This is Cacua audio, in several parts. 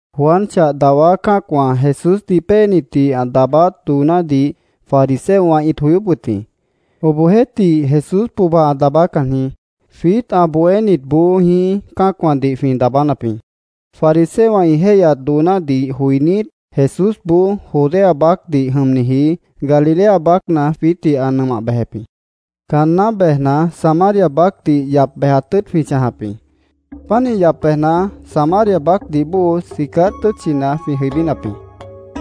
Juan chah dawá cã́acwã Jesúsdih péenitdih ã daabáát doonádih fariseowã ĩt joyóp wʉt jĩ. Obohjeéhtih, Jesús pohba ã daabácan jĩí. Jwiít ã bohénitboó jĩí cã́acwãdih jwĩ daabánap jĩ. Fariseowã ĩ jéihyat doonádih joinít, Jesúsboó Judea baácdih jʉmniji Galilea baácna jwiítdih ã nʉmah bejep jĩ. Caanná bejna, Samaria baácdih yap bejat tʉ́ʉt jwĩ chãjap jĩ. Pánih yap bejna, Samaria baácdih bóo Sicar tʉ́tchina jwĩ jʉibínap jĩ.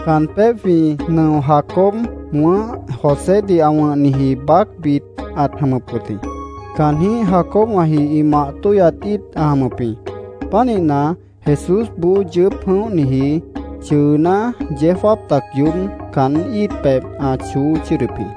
Caan pébh jwĩ nʉo Jacob ã wʉ̃ʉ́h Josédih ã wʉ̃hniji baácbit ãt jʉmʉp wʉt jĩ. Caanjĩ́h Jacobwãji ĩ mah tóihyat íit ã jʉmʉp jĩ. Pánihna, Jesúsboó yʉʉ́p jʉ̃óhniji chʉʉná, yeó jáap tac yoób caán íit pebh ã choó chʉ́ʉdʉp jĩ.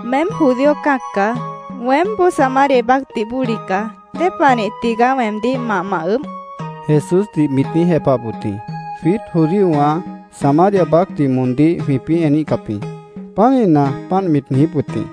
—Meém judío cã́ac caá. Weémboó Samaria baácdih bóli caá. ¿Dépanih tigaá weemdíh mah ma ʉʉ́bh? Jesúsdih mit niíj jepahap wʉt jĩ. (Jwiít judíowã Samaria baácdih moondíh jwĩpĩ́ eníhcap jĩ. Pánihna, páant mit niijíp wʉt jĩ.)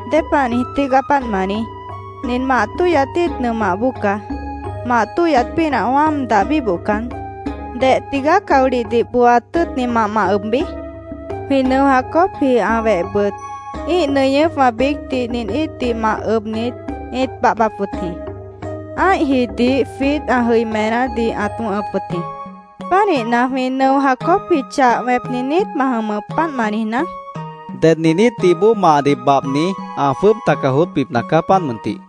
—¿Dépah niij tígaá páant ma niíj? Nin mah tóhyat íit nʉmah bóo caá. Mah tóhyat pínah wáam dah bíbohcan, ¿deh tigaá caolihdih booat tʉ́ʉtni mah ma ʉbbi? Jwĩ nʉo Jacobji, ã wehbʉt, ĩ́ih nʉñʉ́pwã biícdih nin íitdih mah ʉbnit, ĩt babhbap wʉt jĩ. Ã́ihjidih jwiít ã jʉimenádih ãt wʉ̃hʉp wʉt jĩ. ¿Pánihna, jwĩ nʉo Jacobji chah wẽpni niít ma jʉmʉp, páant ma niijná? mit niijíp wʉt jĩ. —Ded nin íitdih bóo mahdih babhni ã jwʉ́ʉb taca joótbipna caá, páant mʉntih.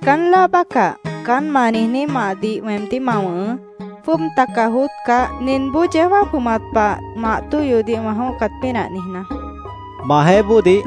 —Caán láa bácah, caán ma niijní mahdih weemdíh ma wʉ̃hʉʉ́, jwʉ́ʉb taca joótcah, ninboó yeó jáap jʉmat pah mah tóhyodih wã jʉ̃óhcat pínah niijná, mit niijíp wʉt jĩ.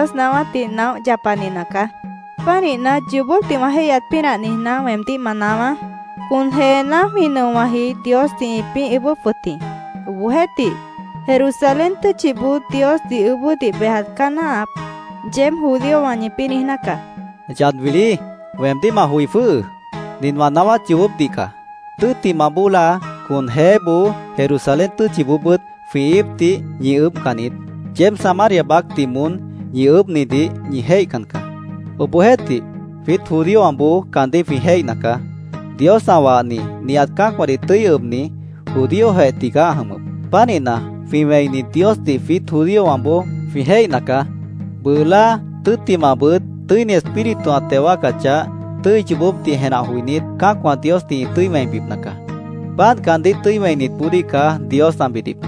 —Meémboó Dios naáwátdih naóh yapani nacaá. Pánihna, yoobópdih wã jéihyat pínah niijná, weemdíh ma naáwá: Con jeená jwĩ nʉowãji Diosdih ĩpĩ́ ʉʉ́bʉ́p wʉt jĩ. Obohjeéhtih, ‘Jerusalén tʉ́tchiboó Diosdih ʉʉ́bʉ́dih bejat caá náahap’, yeéb judíowã ñipĩ́ niijná caá, mit niijíp wʉt jĩ. —Yad wilí, weemdíh ma joi jwʉ́hʉʉ́. Nin wã naáwát yoobópdih caá. Tʉ́ttimah bóo láa, con jeéboó, Jerusalén tʉ́tchiboobʉ́t jwĩ íipdih ñi ʉʉ́bhcan niít. Yeéb Samaria baácdih moón ñi ʉʉ́bhnidih ñi jéihcan caá. Obohjeéhtih, jwiít judíowãboó caandíh jwĩ jéihna caá. Dios ã wahni, nihat cã́acwãdih tʉ́i ʉbni, judíojeh tigaá ã jʉmʉp. Pánihna, jwĩ wẽini Diosdih jwiít judíowãboó jwĩ jéihna caá. Bʉʉ láa, tʉ́ttimahbʉt Tʉ́ini Espíritu ã teo wáacachah, tʉ́i yoobópdih jenah joinít, cã́acwã Diosdih ĩ tʉ́i wẽibipna caá. Páant caandíh tʉ́i wẽinitboodíh caá Dios ã bidip.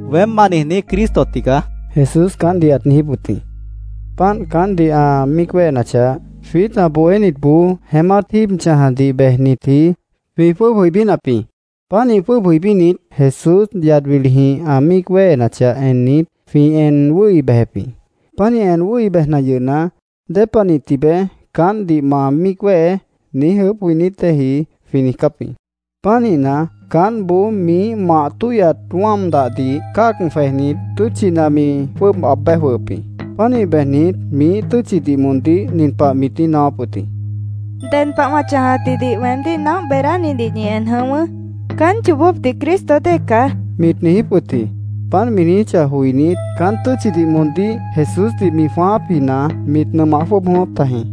—Weém ma niijní Cristo tigaá, Jesús caántdih ãt niijíp wʉt jĩ. Páant caántdih ã míic wéhenachah, jwiít ã bohénitboó jeémát jíib chãjadih bejnitji jwĩ jwʉ́ʉb jʉibínap jĩ. Pánih jwʉ́ʉb jʉibínit, Jesús yad wilijĩh ã míic wéhenachah ennit, jwĩ en wʉ́hi bejep jĩ. Pánih en wʉ́hi bejna yʉhna, “¿Dépanih tibeé caántdih ma míic wéhe?” niíj ʉʉ́bh joinít déeji jwĩ niijcáp jĩ. Pánihna, caántboó miíh mah tóhyat wáam dahdih cáag jwejnit, tʉ́tchina mi jwʉ́ʉb aab béj jwʉhʉp jĩ. Pánih bejnit, miíh tʉ́tchidih moondíh nin pah mit niíj naáwáp wʉt jĩ: —Ded pah wã chãjatjidih weemdíh naóh beedánidih ñi en jʉ̃ʉ́wʉ́. Caán yoobópdih Cristo dée caá, mit niijíp wʉt jĩ. Páant mi niijíchah joinít, caán tʉ́tchidih moondíh Jesúsdih mi jwãáápjina mit nʉmah jwʉ́ʉb jʉ̃ʉ́wʉ́p tajĩ.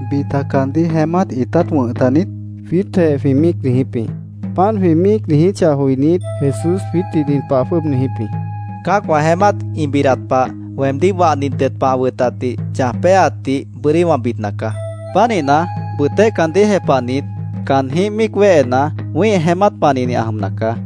—¿Bita caandíh jeémát ĩtát wʉ̃h taniít? jwiítjeh jwĩ míic niijíp jĩ. Páant jwĩ míic niijíchah joinít, Jesús jwiítdih nin pah ã jwʉ́ʉb niijíp jĩ: —Cã́acwã jeémát ĩ bidat pah, weemdíh wahni ded pah ã wʉtatdih chãj péaatdih bʉ́dí wã bidna caá. Pánihna, bʉtéh caandíh jepahnit, caántjĩh míic wéhena, wĩ́ih jeémát panihni ã jʉmna caá.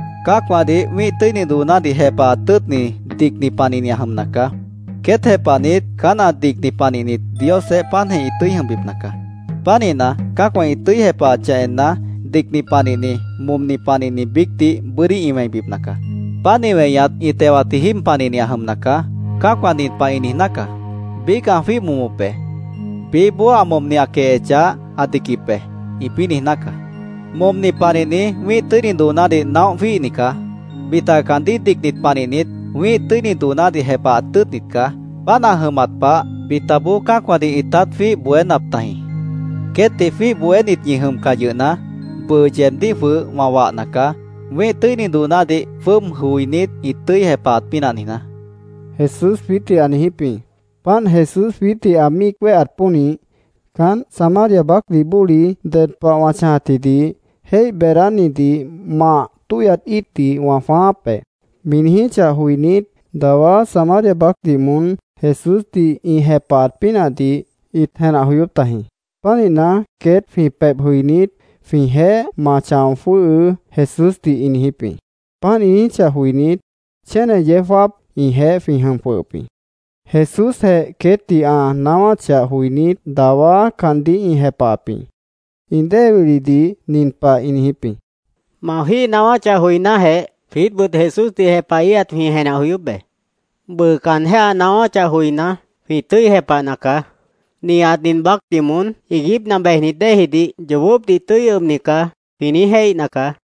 Cã́acwãdih wĩ́ih tʉ́ini doonádih jepahat tʉ́ʉtni dicni panihni ã jʉmna caá. Queét jepahnit, caán ã dicni panihnit, Diosjeéh páantjeh ĩ tʉ́i jʉmbipna caá. Pánihna, cã́acwã ĩ tʉ́i jepahachah enna, dicni panihni, momni panihni biícdih bʉ́dí ĩ wẽibipna caá. Páant ĩ weñat ĩ tewatji jíib panihni ã jʉmna caá. Cã́acwã nin pah ĩ niijná caá: ‘Biíc ã jwíih momop be. Biíhboó ã momni ã quehechah ã diquip be’, ĩpĩ́ niijná caá. Momni panihni wĩ́ih tʉ́ini doonádih naóh jwíihni caá. Bita caandíh dicnit panihnit wĩ́ih tʉ́ini doonádih jepahat tʉ́ʉtnit caá. Páant ã jʉmat pah, bitaboó cã́acwãdih ĩtát jwíih bohénap tajĩ. Queétdih jwíih bohénit ñi jʉmcah yʉhna, bʉʉ yeebdíh jwʉh wã wahna caá, wĩ́ih tʉ́ini doonádih jwʉ́ʉb joinít ĩ tʉ́i jepahat pínah niijná, Jesús jwiítdih ã niijíp jĩ. Páant Jesús jwiítdih ã míic wéheat pónih, caánt Samaria baácdih bóli “Ded pah wã chãjatjidih jéih beedánidih mah tóhyop íitdih wã jwãááp be”, mi niijíchah joinít, dawá Samaria baácdih moón Jesúsdih ĩ jepahat pínahdih ĩt jenah joyóp tajĩ. Pánihna, queét jwĩ pebh jʉinít, “jwĩjeéh ma chão jwʉ́hʉʉ́”, Jesúsdih ĩ niijíp jĩ. Páant ĩ niijíchah joinít, chéne yeó jáap ĩjeéh jwĩ jʉm jwʉhʉp jĩ. Jesúsjeh queétdih ã naáwáchah joinít, dawá caandíh ĩ jepahap jĩ. Ĩ dée wilidih nin pah ĩ niijíp jĩ: —Ma jwíih naáwáchah joinájeh, jwiítbʉt Jesúsdih jepahíhat jwĩ jenah joyóp be. Bʉʉ caanjéh ã naáwáchah joiná, jwĩ tʉ́i jepahna caá. ‘Nihat nin baácdih moón iiguípna bejnit déejidih yoobópdih tʉ́i ʉbni caá’, jwĩ niíj jéihna caá, ĩ niijíp jĩ.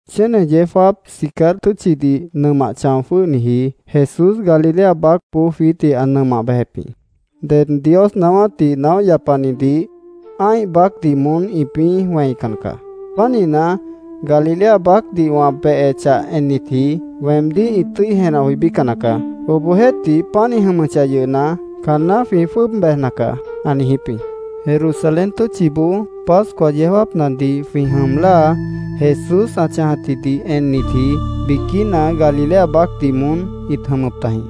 Chéne yeó jáap Sicar tʉ́tchidih nʉmah chão jwʉ́hniji, Jesús Galilea baácboó jwiítdih ã nʉmah bejep jĩ. “Ded Dios naáwátdih naóh yapanidih ã́ih baácdih moón ĩpĩ́ wẽican caá. Pánihna, Galilea baácdih wã behechah ennitji, weemdíh ĩ tʉ́i jenah joibícan nacaá. Obohjeéhtih, páant ĩ jʉmʉchah yʉhna, caanná jwĩ jwʉ́ʉb bejna caá”, ã niijíp jĩ. Jerusalén tʉ́tchiboó Pascua yeó jáapnadih jwĩ jʉm láa, Jesús ã chãjatjidih ennitji biquína Galilea baácdih moón ĩt jʉmʉp tajĩ.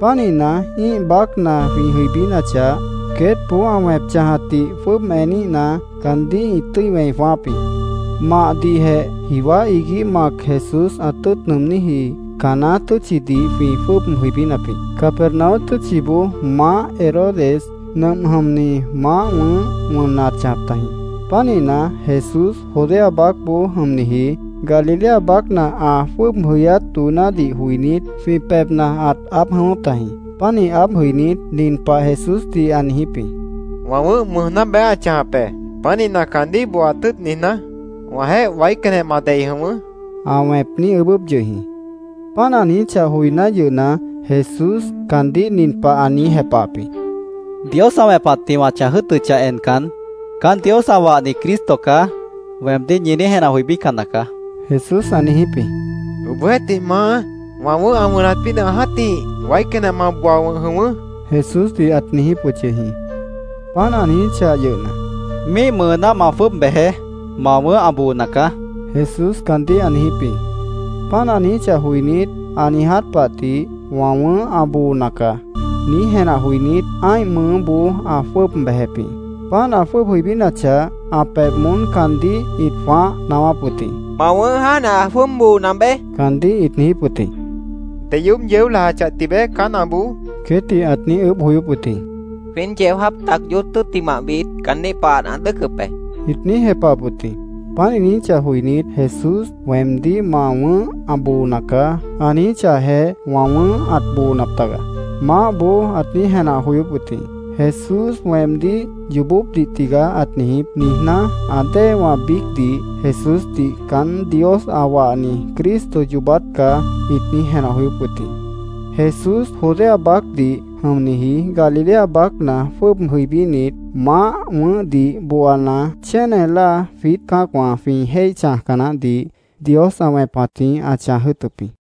Pánihna, ĩ́ih baácna jwĩ jʉibínachah, queétboó ã wẽp chãjatdih jwʉ́ʉb eníhna, caandíh ĩ tʉ́i wẽi jwãááp jĩ. Mahdihjeh jiwá iguíh mac Jesús ã tʉ́ʉt nʉʉmníji Caná tʉ́tchidih jwĩ jwʉ́ʉb jʉibínap jĩ. Capernaum tʉ́tchiboó maáh Herodes nʉmp jʉmni maáh wʉ̃ʉ́h wʉnna ãt chãjap tajĩ. Pánihna, Jesús Judea baácboó jʉmniji Galilea baácna ã jwʉ́ʉb jʉyát doonádih joinít, jwĩ pebhna ãt aáb jʉ̃ʉ́wʉ́p tajĩ: Pánih aáb jʉinít, nin pah Jesúsdih ã niijíp jĩ: —Wã wʉ̃ʉ́h mʉʉjná beé ã chãjap be. Pánihna, caandíh booaat tʉ́ʉt niijná, wãjeéh waícanjeh ma dei jʉ̃ʉ́wʉ́, ã wẽp niíj ʉʉ́bʉ́p yʉh jĩ. Páant ã niijíchah joiná yʉhna, Jesús caandíh nin pah ã niíj jepahap jĩ: —Dios ã wẽpatjĩh wã chãj jʉ́ʉtʉchah encan, ‘Caán Dios ã wahni Cristo caá’, weemdíh ñi niíj jenah joibícan nacaá, Jesús ã niijíp jĩ. —Obohjeéhtih, Maá, wã wʉ̃ʉ́h ã wʉnat pínah jã́tih, waícanjeh ma booa wʉ̃h jʉ̃ʉ́wʉ́, Jesúsdih ã niijíp yʉh jĩ. Páant ã niijíchah yʉhna, —Míih mʉʉná ma jwʉ́ʉb bejeé. Ma wʉ̃ʉ́h ã boona caá, Jesús caandíh ã niijíp jĩ. Páant ã niijíchah joinít, “Ã niiját pah tih wã wʉ̃ʉ́h ã boona nacaá”, niíj jenah joinít, ã́ih mʉʉ́boó ã jwʉ́ʉb bejep jĩ. Páant ã jwʉ́ʉb jʉibínachah, ã pebh moón caandíh ĩt jwãáh naáwáp wʉt jĩ: —Ma wʉ̃ʉ́h jáantjeh ã jwʉ́ʉb boona beé, caandíh ĩt niijíp wʉt jĩ. —¿Deyoób yeó lajachah tibeé caán ã boo? queétdih ãt niíj ʉʉ́bh joyóp wʉt jĩ. —Jwíin yeó jáap tac yoób tʉ́ttimahbit caandíh pahat ã dʉ́ʉcʉp be, ĩt niíj jepahap wʉt jĩ. Páant ĩ niijíchah joinít, “Jesús weemdíh ‘Ma wʉ̃ʉ́h ã boona caá’, ã niijíchahjeh, wã wʉ̃ʉ́h ãt boonap taga”, maáhboó ãt niíj jenah joyóp wʉt jĩ. “Jesús weemdíh yoobópdih tigaá ãt niijíp”, niijná, ã déewã biícdih Jesúsdih “Caán Dios ã wahni Cristo yoobát caá”, ĩt niíj jenah joyóp wʉt jĩ. Jesús Judea baácdih jʉmniji Galilea baácna jwʉ́ʉb jʉibínit, maáh wʉ̃ʉ́hdih booana, chéne láa jwiít cã́acwã jwĩ jéih chãjca naáhdih Dios ã wẽpatjĩh ã chãj jʉ́ʉtʉp jĩ.